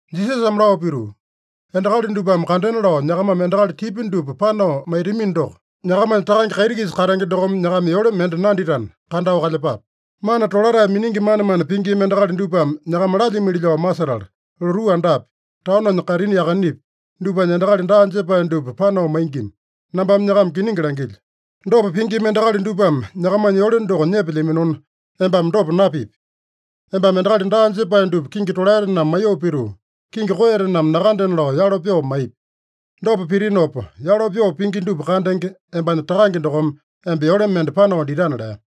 Jisasame lao pituu, “Endakali dupame kandena lao nyakamame endakali tipya dupa panao maitamino doko, nyakamanya Takange kaiti-kisa katenge dokome nyakama yole mende nanditana, kandao kalyepape. Mana tolatae miningi manemane pingima endakali dupame nyakama lalyimili lao masetala, lotuu andapi, taononya kaitini yakanepi, dupanya endakali daa jepae dupa panao maingima. Nambame nyakama kiningi langilyo: Dopa pingima endakali dupame nyakamanya yole doko nyepelyaminona, embame dopa napipi. Embame endakali daa jepae dupa kingi tolaetename maiyoo pituu, kingi koeyatename nakandena lao yalo pyoo maipi. Dopa pitinopa, yalo pyoo pingi dupa kandenge, embanya Takange dokome emba yole mende panao ditana” lea.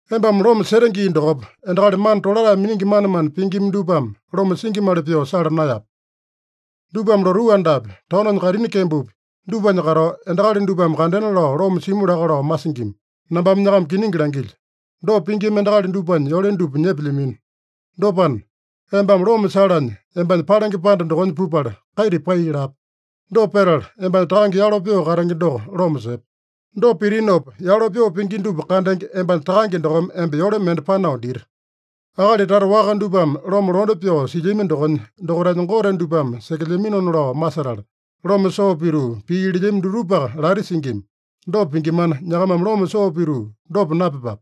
“Embame loma sete gii dokopa, endakali mana tolatae miningi manemane pingima dupame loma singimali pyoo sala naeyape. Dupame lotuu andapi, taononya kaitini kembopi dupanya katao, endakali dupame kandena lao loma simu laka lao masingima. Nambame nyakama kiningi langilyo: Dopa pingima endakali dupanya yole dupa nyepelyamino. Dopana, embame loma salanya, embanya palenge panda dokonya pupala, kaita pai lape. Dopa petala, embanya Takange yalo pyoo katenge doko loma sepe. Dopa pitinopa, yalo pyoo pingi dupa kandenge, embanya Takange dokome emba yole mende panao dita. “Akali tata waka dupame loma londe pyoo silyami dokonya, dokaitanya gote dupame sekelyaminona lao masetala, loma soo pituu pii lelyami dutupaka lati singima. Dopa pingimana, nyakamame loma soo pituu dopa napyepape.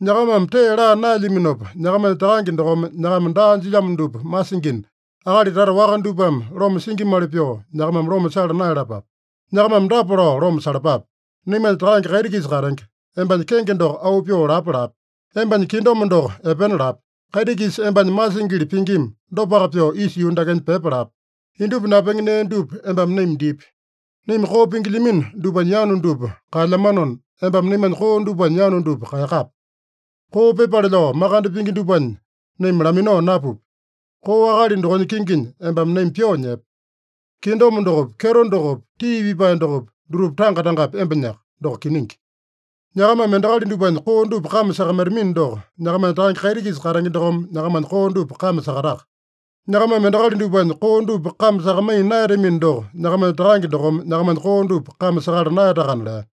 Nyakamame tee laa naelyaminopa, nyakamanya Takange dokome nyakama daa jilyamo dupa masingina, akali tata waka dupame loma singimali pyoo nyakamame loma sala naeyalapape. Nyakamame dapa lao loma salapape: Naimanya Takange kaiti-kisa katenge, embanya kenge doko auu pyoo lapa lape. Embanya kingdom doko epena lape. Kaiti-kisa embanya masingili pingima, dopaka pyoo isa yuu dakenya pyepa lape. Indupa napenge nee dupa embame naima dipi. Naima koo pingilyamino dupanya yanu dupa kaelyamanona, embame naimanya koo dupanya yanu dupa kaeyakape. Koo pyepale lao makande pingi dupanya naima laminao napupi. Koo akali dokonya kinginya embame naima pyoo nyepe. Kingdom dokopi, kyeto dokopi, tii pipae dokopi, dutupa tanga-tangapi embanyaka. Doko kiningi. Nyakamame endakali dupanya koo dupa kame sakamaitamino doko, nyakamanya Takange kaiti-kisa katenge dokome nyakamanya koo dupa kame sakataka. Nyakamame endakali dupanya koo dupa kame sakamaiya naeyatamino doko, nyakamanya Takange dokome nyakamanya koo dupa kame sakala naeyatakana” lea.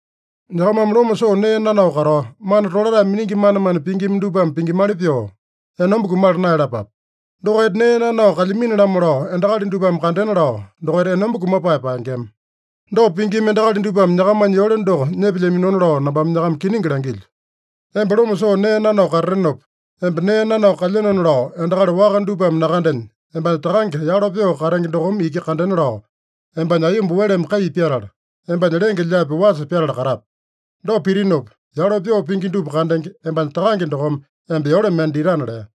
“Nyakamame loma soo nee nanao katao, mana tolatae miningi manemane pingima dupame pingimali pyoo, enomba kumala naeyalapape. Dokaita nee nanao kalyamini-lamo lao endakali dupame kandena lao, dokaita enomba kumapae paengema. Dopa pingima endakali dupame nyakamanya yole doko nyepelyaminona lao nambame nyakama kiningi langilyo. Emba loma soo nee nanao katatenopa, emba nee nanao kalyenona lao endakali waka dupame nakandenya, embanya Takange yalo pyoo katenge dokome iki kandena lao, embanya aiyomba weleme kai pyatala, embanya lenge-lyaapi wasa pyatala katape. Dopa pitinopa, yalo pyoo pingi dupa kandenge, embanya Takange dokome emba yole mende ditana” lea.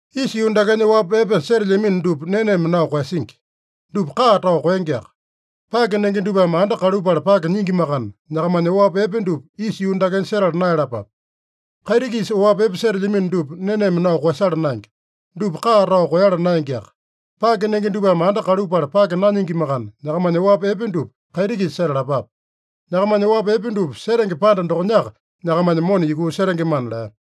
“Isa yuu dakenya oapi epe setelyamino dupa neneme nao koeyasingi. Dupa kaa tao koengeaka. Pake nenge dupame anda kalupala pake nyingimakana, nyakamanya oapi epe dupa isa yuu dakenya setala naeyalapape. Kaiti-kisa oapi epe setelyamino dupa neneme nao koeyasala naenge. Dupa kaa tao koeyala naengeaka. Pake nenge dupame anda kalupala pake nanyingimakana, nyakamanya oapi epe dupa kaiti-kisa setalapape. Nyakamanya oapi epe dupa setenge panda dokonyaka nyakamanya mona yukuu setengemana” lea.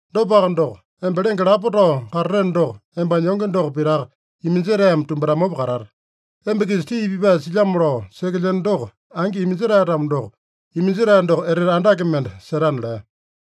Dopaka doko, emba lenge lapo tao katateno doko, embanya yonge doko pitaka iminjetaeme tumbatamopa katate. Emba-kisa tii pipae silyamo lao sekelyeno doko angi iminjetae-tamo doko, iminjetae doko etete andake mende setana” lea.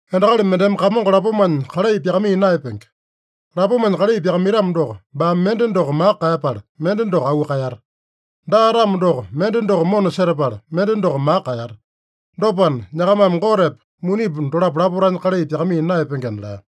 “Endakali mendeme kamongo lapomanya kalai pyakamaiya naeyapenge. Lapomanya kalai pyakamaitamo doko, baame mende doko maka kaeyapala, mende doko auu kaeyata. Daa-tamo doko, mende doko mona setapala, mende doko maka kaeyata. Dopana, nyakamame Gotepa, munipa dolapo lapotanya kalai pyakamaiya naeyapengena” lea.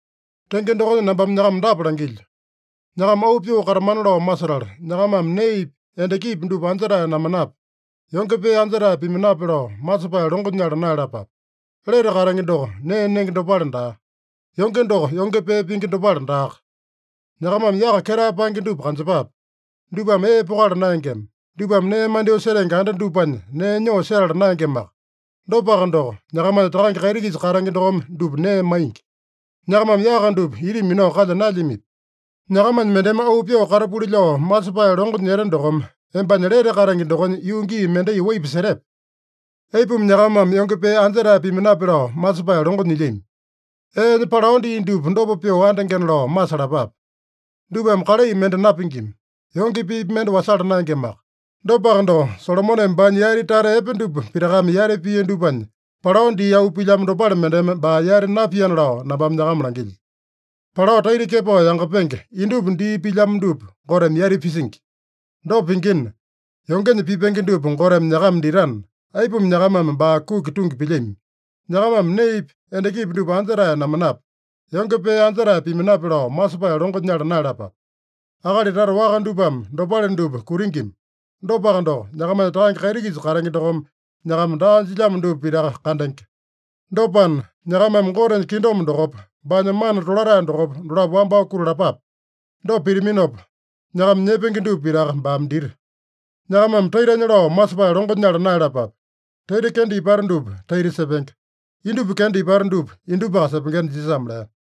“Tenge dokonya nambame nyakama dapa langilyo: Nyakama auu pyoo katamana lao masetala, nyakamame neepi, endakipi dupa anja-tae namanape, yonge pee anja-tae pimanape lao masepae longo nyala naeyalapape. Lete katenge doko nee nenge dopale daa. Yonge doko yonge pee pingi dopale daaka. Nyakamame yaka ketae paenge dupa kanjepape. Dupame ee pokala naengema. Dupame nee mandyoo setenge anda dupanya nee nyoo setala naengemaka. Dopaka doko, nyakamanya Takange kaiti-kisa katenge dokome dupa nee maingi. Nyakamame yaka dupa ita minao kalya naelyamipi? Nyakamanya mendeme auu pyoo katapuli lao masepae longo nyete dokome, embanya lete katenge dokonya yuu gii mendai waipa setepe? Aipuma nyakamame yonge pee anja-tae pimanape lao masepae longo nyilyami? Eenya palao dii dupa dopa pyoo andengena lao masalapape. Dupame kalai mende napingima. Yonge peepi mende wasala naengemaka. Dopaka doko, Solomoneme baanya yati tata epe dupa pitakame yati pia dupanya, palao dii auu pilyamo dopale mendeme baa yati napiana lao nambame nyakama langilyo. Palao taita kepao yangapenge, indupa dii pilyamo dupa Goteme yati pisingi. Dopa pingina, yongenya pipenge dupa Goteme nyakama ditana, aipuma nyakamame baa kuki tungi pilyami? Nyakamame neepi, endakipi dupa anja-tae namanape, yonge pee anja-tae pimanape lao masepae longo nyala naeyalapape. Akali tata waka dupame dopale dupa kutingima. Dopaka doko, nyakamanya Takange kaiti-kisa katenge dokome nyakama daa jilyamo dupa pitaka kandenge. Dopana, nyakamame Gotenya kingdom dokopa, baanya mana tolatae dokopa, dolapo wambao kutalapape. Dopa pitaminopa, nyakama nyepenge dupa pitaka baame dita. “Nyakamame taitanya lao masepae longo nyala naeyalapape. Taita kenda ipata dupa taita sepenge. Indupa kenda ipata dupa indupaka sepengena” Jisasame lea.